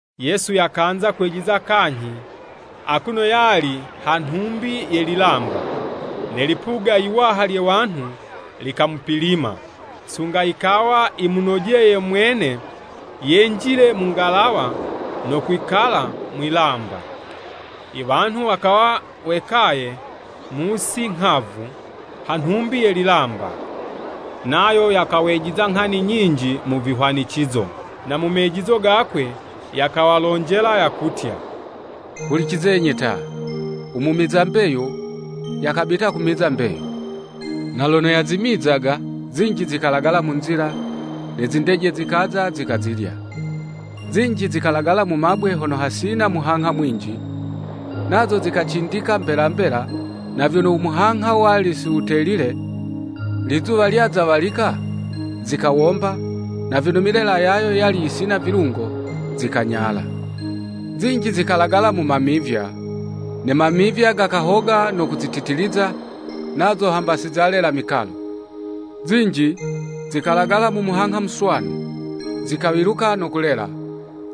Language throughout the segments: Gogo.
Yesu yakanza kwijiza kanyhi, akuno yali ha nhumbi ye lilamba. Ne lipuga yiwaha lye wanhu likamupilima, sunga yikawa yimunojeye mwene yenjile mu ngalawa no kwikala mwi'lamba. I wanhu wakawa wekaye mu'si nghavu, ha nhumbi ye lilamba. Nayo yakawejiza nghani nyinji mu vihwanicizo, na mu mejizo gakwe yakawalonjela, yakutya, “Hulicizenyi ta! U mumiza mbeyu yakabita kumiza mbeyu. Na lono yazimizaga, zinji zikalagala mu nzila, ne zindeje zikaza zikazilya. Zinji zikalagala mu mabwe hono hali hasina muhangha mwinji, nazo zikacindika mbela, mbela, na vyono u muhangha wali siwutelile, lizuwa lyaza walika, zikawomba, na vyono milela yayo yali yisina vilungo, zikanyala. Zinji zikalagala mu mamivya, ne mamivya gakahoga no kuzititiliza, nazo hamba sizalela mikalo. Zinji zikalagala mu muhangha muswanu, zikawiluka no kulela: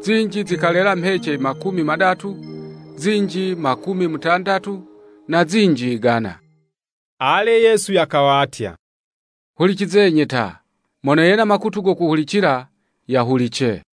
zinji zikalela mhece makumi madatu, zinji makumi mutandatu, na zinji yigana.” Ale Yesu yakawatya, “Hulicizenyi ta, mono yena makutu go kuhulicila, yahulice.”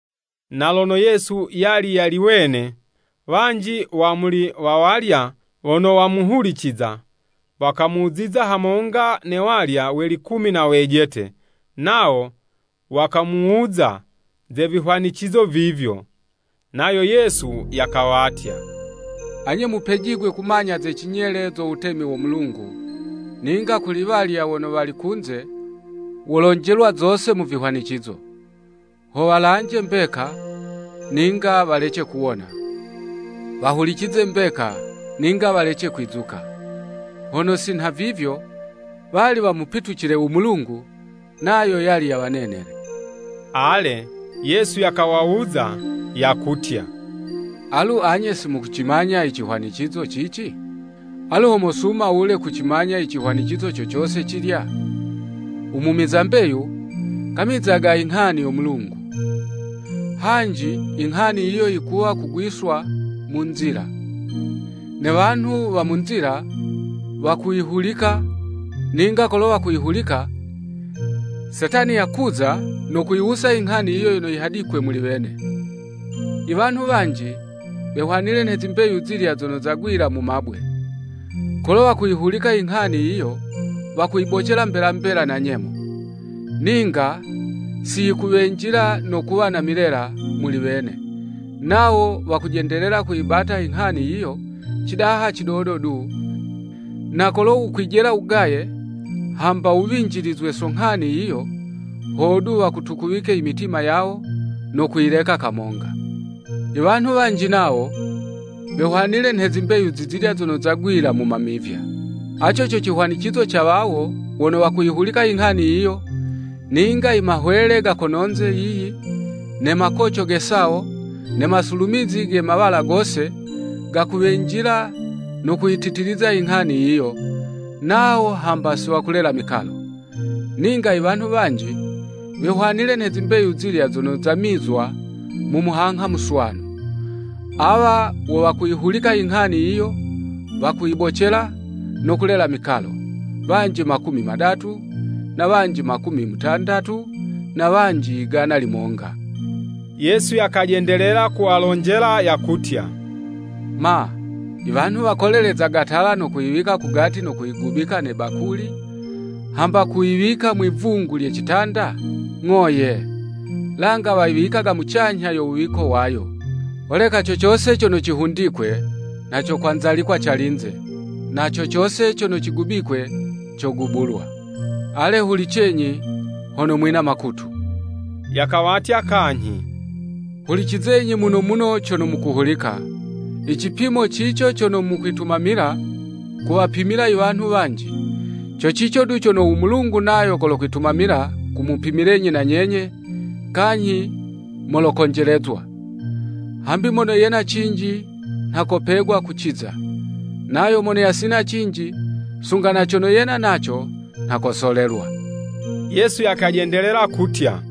Na lono Yesu yali yali wene, wanji wa muli wawalya wono wamuhuliciza, wakamuziza hamonga na walya we likumi na wejete, nawo wakamuwuza ze vihwanicizo vivyo. Nayo Yesu yakawatya, “Anye mupejigwe kumanya ze cinyele zo wutemi wo Mulungu, ninga kuli walya wono wali kunze, wolonjelwa zose mu vihwanicizo. ‘Ho walanje mbeka, ninga walece kuwona. Wahulicize mbeka, Ninga walece kwizuka. Hono si nhavivyo, wali wamupitucile u Mulungu, nayo yali yawanenele.'" Ale, Yesu yakawawuza yakutya, “Alu anye simukucimanya i cihwanicizo cici? Alu ho mosuma wule kucimanya icihwanicizo co cose cilya? U mumiza mbeyu, kamizaga inghani yo Mulungu. Hanji i nghani yiyo yikuwa kugwiswa mu nzila, ne wanhu wa mu nzila wakuyihulika, ninga kolo wayihulika, Setani yakuza no kuyiwusa inghani yiyo yono yihadikwe muli wene. I wanhu wanji wehwanile nhe zimbeyu zilya zono zagwila mu mabwe. Kolo wakuyihulika inghani yiyo wakuyibocela mbela mbela na nyemo. Ninga siyikuwenjila no kuwa na milela muli wene, nawo wakujendelela kuyibata inghani yiyo cidaha cidodo du, na kolo wukwijela wugaye, hamba wuwinjilizwe so nghani yiyo, hodu wakutukuwike i mitima yawo, no kuyileka kamonga. Iwanhu wanji nawo, wehwanile nhe zimbeyu zilya zono zagwila mu mamivya. Aco co cihwanicizo ca wawo wono wakuyihulika inghani yiyo, ninga i mahwele ga kononze yiyi, ne makoco ge sawo, ne masulumizi ge mawala gose, gakuwenjila no kuyititiliza inghani yiyo, nawo hamba siwakulela mikalo. Ninga iwanhu wanji, wehwanile nhe zimbeyu zilya zono zamizwa mu muhangha muswanu. Awa wo wakuyihulika i nghani yiyo, wakuyibocela, no kulela mikalo: wanji makumi madatu, na wanji makumi mutandatu na wanji igana limonga.” Yesu yakajendelela kuwalonjela yakutya, “Ma, i wanhu wakolelezaga tala wayileta kugati no kuyigubika ne bakuli hamba kuyiwika mwi'vungu lye citanda? Ng'o ye! Langa wayiwikaga mucanyha yo wuwiko wayo. Holeka co cose cono cihundikwe nha cokwanzalikwa calinze, na co cose cono cigubikwe, cogubulwa. Ale, hulicenyi, hono mwina makutu!” Yakawatya kanyhi, “Hulicizenyi muno muno cono mukuhulika! I cipimo cico cono mukwitumamila kuwapimila i wanhu wanji, co cico du cono u Mulungu nayo kolokwitumamila kumupimilenyi na nyenye, kanyhi molokonjelezwa. Hambi mono yena cinji nha kopegwa kuciza. Nayo mono yasina cinji, sunga na cono yena naco nha kosolelwa.” Yesu yakajendelela kutya,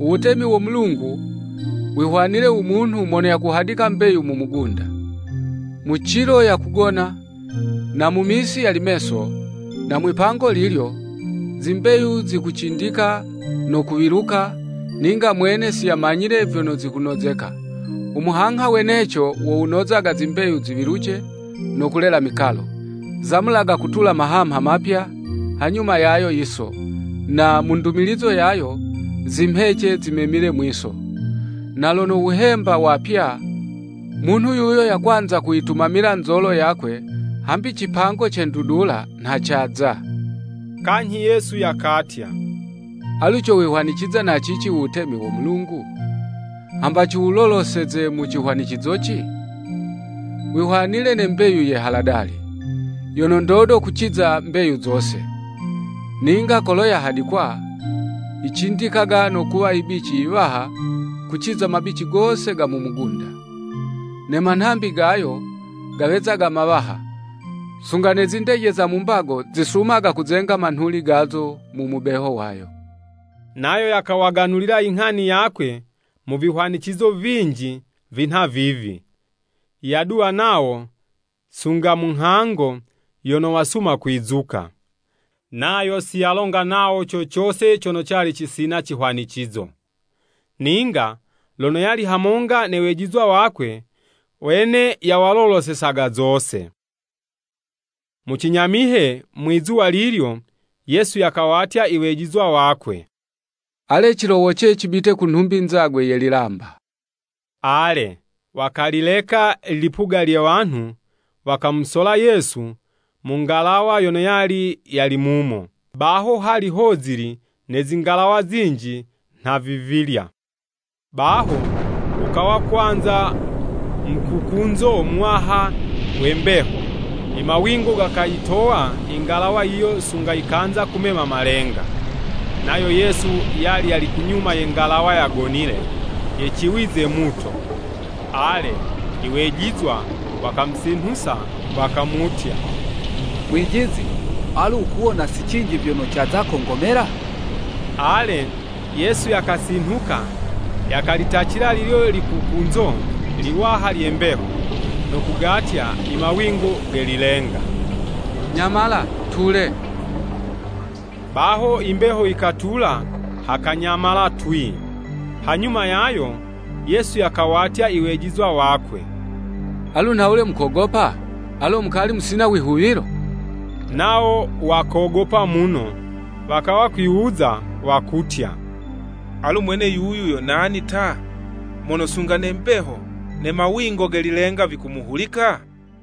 “Uwutemi wo Mulungu wihwanile u munhu mono yakuhadika mbeyu mu mugunda. Mu cilo yakugona, na mu misi yali meso, na mwipango lilyo, zimbeyu zikucindika no kuwiluka ninga mwene siyamanyile vyono zikunozeka. U muhangha weneco wo wunozaga zimbeyu ziwiluce no kulela mikalo; zamulaga kutula mahamha mapya hanyuma yayo yiso, na mu ndumilizo yayo, zimhece zimemile mwi'so. Na lono wuhemba wapya, munhu yuyo yakwanza kuyitumamila nzolo yakwe, hambi cipango ce ndudula nha caza.” Kanyhi Yesu yakatya, “Alu cowihwaniciza na cici u Wutemi wo Mulungu? Hamba ciwuloloseze mu cihwanicizoci? Wihwanile nhe mbeyu ye haladali, yono ndodo kuciza mbeyu zose. Ninga kolo yahadikwa, yicindikaga no kuwa ibici iwaha kuciza mabici gose ga mu mugunda. Ne manhambi gayo gawezaga mawaha, sunga ne zindeje za mu mbago zisumaga kuzenga manhuli gazo mu mubeho wayo.” Nayo yawaganulila i nghani yakwe mu vihwanicizo vinji vinha vivi, yaduwa nawo sunga mu nghango yono wasuma kwizuka. Nayo siyalonga nawo co cose cono cali cisina cihwanicizo, ninga lono yali hamonga ne wejizwa wakwe, wene, yawalolosesaga zose. Mu cinyamihe, mwi'zuwa lilyo, Yesu yakawatya iwejizwa wakwe, “Alenyi cilowoce, cibite ku nhumbi nzagwe ye lilamba.” Ale, wakalileka ilipuga lye wanhu, wakamusola Yesu mu ngalawa yono yali yali mumo. Baho hali hozili ne zingalawa zinji nha vivilya. Baho, wukawa kwanza mukukunzo muwaha we mbeho, imawingo gakayitowa i ngalawa yiyo sunga yikanza kumema malenga. Nayo Yesu yali yali kunyuma ye ngalawa yagonile, yeciwize muto. Ale, i wejizwa wakamusinhusa wakamutya, “Mwijizi, alu wukuwona si cinji vyono caza kongomela?” Ale, Yesu yakasinhuka, yakalitacila lilyo likukunzo liwaha lye mbeho, no kugatya i mawingo ge lilenga, “Nyamala! Tule!” Baho i mbeho yikatula hakanyamala twii. Hanyuma yayo Yesu yakawatya iwejizwa wakwe, “Alu nhawule mukogopa?” Alo mukali musina wihuwilo? Nawo wakogopa muno, wakawa kwiwuza wakutya, “Alu mwene yuyu yo nani, ta? Mono sunga ne mbeho ne mawingo ge lilenga vikumuhulika?”